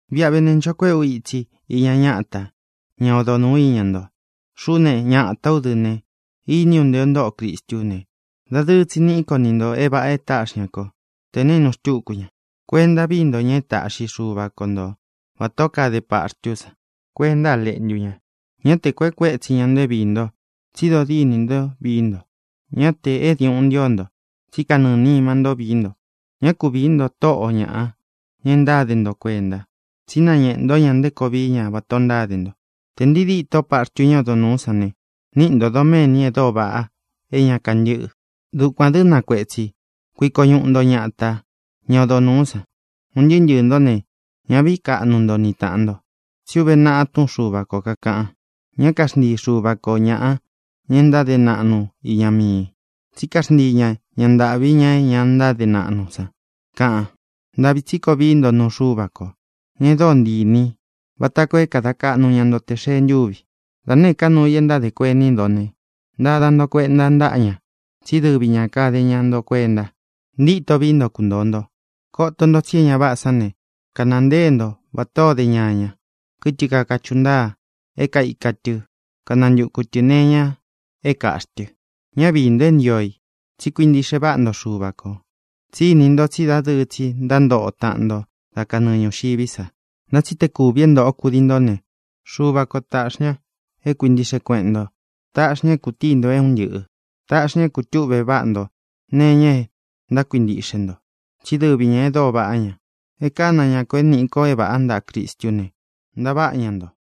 Viꞌa ve ne, ncho kuéꞌe ú itsi iña ñáta, ña odo nūú iña nto. Xuꞌú ne, ñatā ú dɨ ne, iní u nté ō ntóꞌo Cristú ne, dadɨɨ tsi niꞌi ko ni ntō é vāꞌa é tāꞌxi ña ko te naínu xtúku ña. Kuenta víi nto ña e táꞌxi Xuva ko nto vatā ó kade paxtú san kuenta a leꞌntu ña. Ñá te kuēꞌe kuétsi ña nto é viī nto, tsi dodíni nto vií nto. Ñá tē é diuꞌun ntío nto, tsí kanɨɨ̄ nima ntó vií nto. Ñá ku viī nto tóꞌo ñaꞌa, ña e ntáde nto kuenta, tsí nañēꞌe ntó ña nté koo vií ña vatā o ntáde nto. Tē ntii díto paxtu ñá odo nūú san ne, níꞌi ntō doméni e dóo vaꞌa é ña kantɨ́ꞌɨ. Dukuān dɨ́, na kuetsī, kuiko ñuꞌu nto ñata, ña odo nūú san. Un ntɨɨ́ ntɨɨ̄ ntó ne, ñá vīí kaꞌnu nto ni tāꞌan nto. Tsí uve naꞌa túꞌun Xuva ko kākaꞌan: Ñá kaxntii Xuva ko ñāꞌa, ña e ntáde naꞌnu iña mii i, tsí kaxntii ña ña ntāꞌvi, ña é ña ntáde naꞌnu san, kaꞌan. Ntāꞌvi tsí koo vií nto nuu Xuva ko, ña e dóo ntii inī í, vata koo é kada kaꞌnu ña nto tē xee ntúvi. Da nēé ka nuu i e ntádē kuení nto ne, ntada nto kuenta ntáꞌa ña, tsí dɨvi ña kade ña nto kuenta. Ntítō vií nto kuntōo nto. Koto nto tsi é ña váꞌā sán ne, kanāa ntée nto vatā ó de ñaña, kɨtɨ kakachuꞌu ntáa é kaika tɨ kanantuku tɨ̄ nee iña é kāꞌxí tɨ. Ñá viī nto é ntio i, tsí kuintiꞌxe váꞌa nto Xuva kō. Tsí ini nto tsí dadɨɨ tsi ntántoꞌo taꞌan nto dá kanɨɨ ñūxiví sa. Ntá tsi tē kúvī é ntōꞌo kudii nto ne, Xuva ko tāꞌxi ña é kuintiꞌxe kueꞌen nto. Taꞌxi ña é kūtíi nto é un ntɨꞌɨ̄. Taꞌxi ña é kūtuꞌve váꞌa nto nee iña e ntákuintiꞌxe nto, tsí dɨvi ñā e dóo vaꞌá ña. E kána ña kō é nīꞌi ko é vāꞌá ntaꞌa Cristú ne, ntaváꞌa ña nto.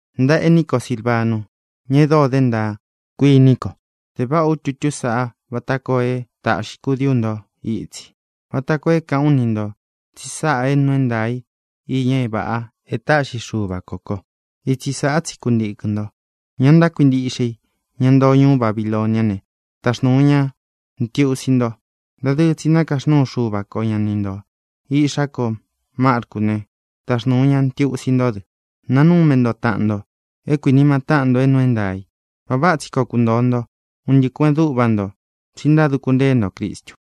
Ntaꞌa ení ko Silvanu, ña e dóo de ntaa, kuíni ko, de váꞌa ú tutú saꞌa vata koo é tāꞌxi kudií u nto itsi, vata koo é kāꞌán u ni ntō tsi sáꞌā é nuu é ntaā i iña é vāꞌa e táꞌxi Xuva ko kō. Itsi sāꞌá tsi kuntīkɨn nto. Ña ntákuintiꞌxe i, ñá ntoo ñuú Babiloniá ne, taxnūu ña ntiusi nto. Dadɨɨ tsi nakaxnúu Xuva ko ña ni ntō. Iꞌxá ko Marcú ne, taxnūu na ntiusi ntó dɨ. Nanume nto taꞌan nto é kuinima táꞌan nto é nuu é ntaā i. Vāꞌa váꞌa tsi koo kuntōo nto, un ntɨꞌɨ kueꞌen dúꞌva nto, tsi ntáduku ntée nto Cristu.